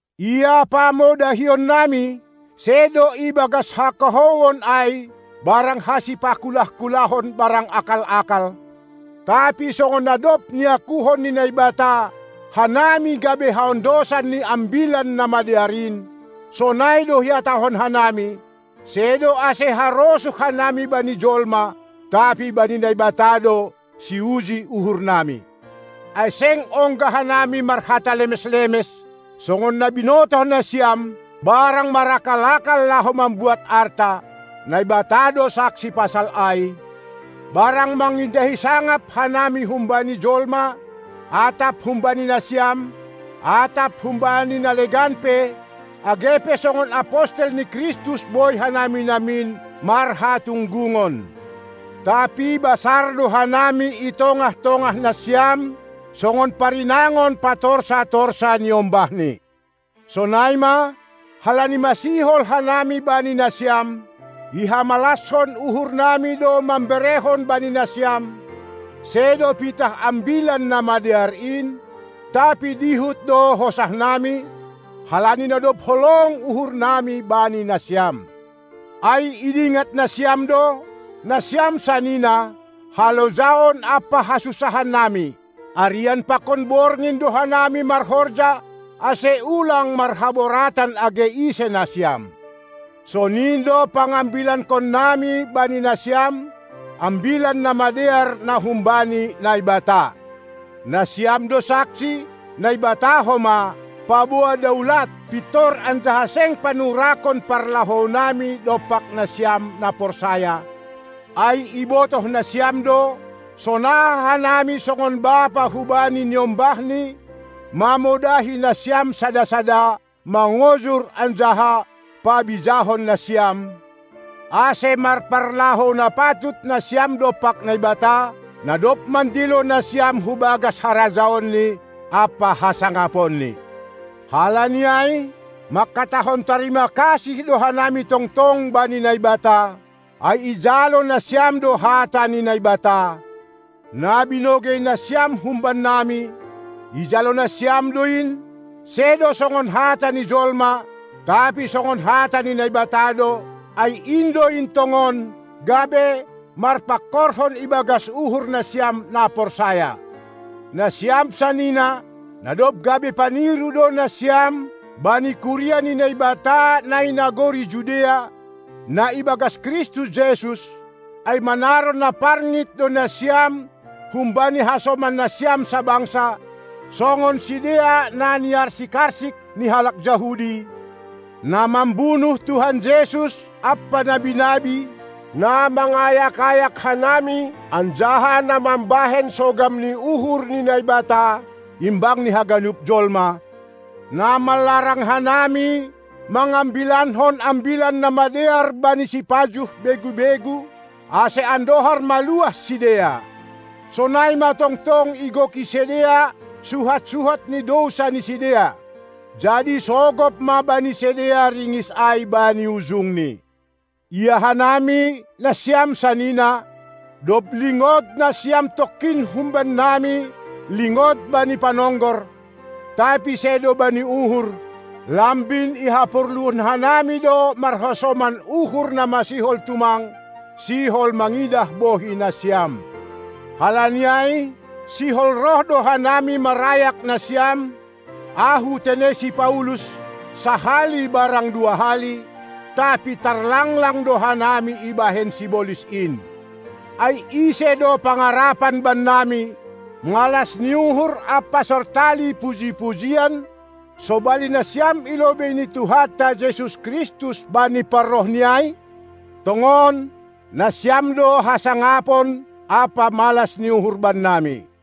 Ia pamodahionnami, sedo ibagas hakahouon ai barang hasipakulah-kulahon barang akal-akal, tapi songon na dob niakuhon ni Naibata hanami gabe haondosan ni Ambilan Namadear in, sonai do ihatahon hanami, sedo ase harosuh hanami bani jolma, tapi bani Naibata do, siuji uhurnami. Ai seng ongga hanami marhata lemes-lemes, songon na binotoh nasiam, barang marakal-akal laho mambuat arta, Naibata do saksi pasal ai; barang mangindahi sangap hanami humbani jolma, atap humbani nasiam, atap humbani na legan pe, age pe songon apostel ni Kristus boi hanami namin marhatunggungon. Tapi basar do hanami i tongah-tongah nasiam songon parinangon patorsa-torsa niombahni. Sonai ma, halani masihol hanami bani nasiam, ihamalashon uhurnami do mamberehon bani nasiam, sedo pitah Ambilan Namadear in, tapi dihut do hosahnami, halani na dob holong uhurnami bani nasiam. Ai idingat nasiam do, nasiam sanina, halojaon ampa hasunsahannami: Arian pakon borngin do hanami marhorja, ase ulang marhaboratan age ise nasiam. Sonin do pangambilankonnami bani nasiam Ambilan Namadear na humbani Naibata. Nasiam do saksi, Naibata homa, paboa daulat, pintor anjaha seng panurakon parlahounami dompak nasiam, na porsaya, ai ibotoh nasiam do, sonaha hanami songon bapa hubani niombahni mamodahi nasiam sada-sada, mangojur anjaha pabijahon nasiam, ase marparlahou na patut nasiam dompak Naibata, na dob mandilo nasiam hu bagas harajaonNi ampa hasangaponNi. Halani ai mangkatahon tarima kasih do hanami tongtong bani Naibata, ai ijalo nasiam do hata ni Naibata, na binogei nasiam humbannami, ijalo nasiam do in, sedo songon hata ni jolma, tapi songon hata ni Naibata do, ai in do in tongon, gabe marpangkorhon ibagas uhur nasiam na porsaya. Nasiam sanina, na dob gabe paniru do nasiam bani kuria ni Naibata na i nagori Judea, na ibagas Kristus Jesus, ai manaron na parngit do nasiam humbani hasoman nasiam sabangsa, songon sidea na niarsik-arsik ni halak Jahudi, na mambunuh Tuhan Jesus ampa nabi-nabi, na mangayak-ayak hanami anjaha na mambahen sogam ni uhur ni Naibata, imbang ni haganup jolma, na manlarang hanami mangambilankon ambilan namadear bani sipajuh begu-begu, ase andohar maluah sidea. Sonai ma tongtong igoki sidea suhat-suhat ni dousa ni sidea. Jadi sogop ma bani sidea ringis ai bani ujungni. Ia hanami, nasiam sanina, dob lingod nasiam tongkin humbannami lingod bani panonggor, tapi sedo bani uhur, lambin ihaporluhon hanami do marhasoman uhur na masihol tumang sihol mangidah bohi nasiam. Halani ai, sihol roh do hanami marayak nasiam, ahu tene si Paulus, sahali barang dua hali, tapi tarlanglang do hanami ibahen sibolis in. Ai ise do pangarapan bannami, malas ni uhur ampa sortali puji-pujian sobali nasiam i lobei ni Tuhanta Jesus Kristus, bani parrohNi ai? Tongon, nasiam do hasangapon ampa malas ni uhur bannami.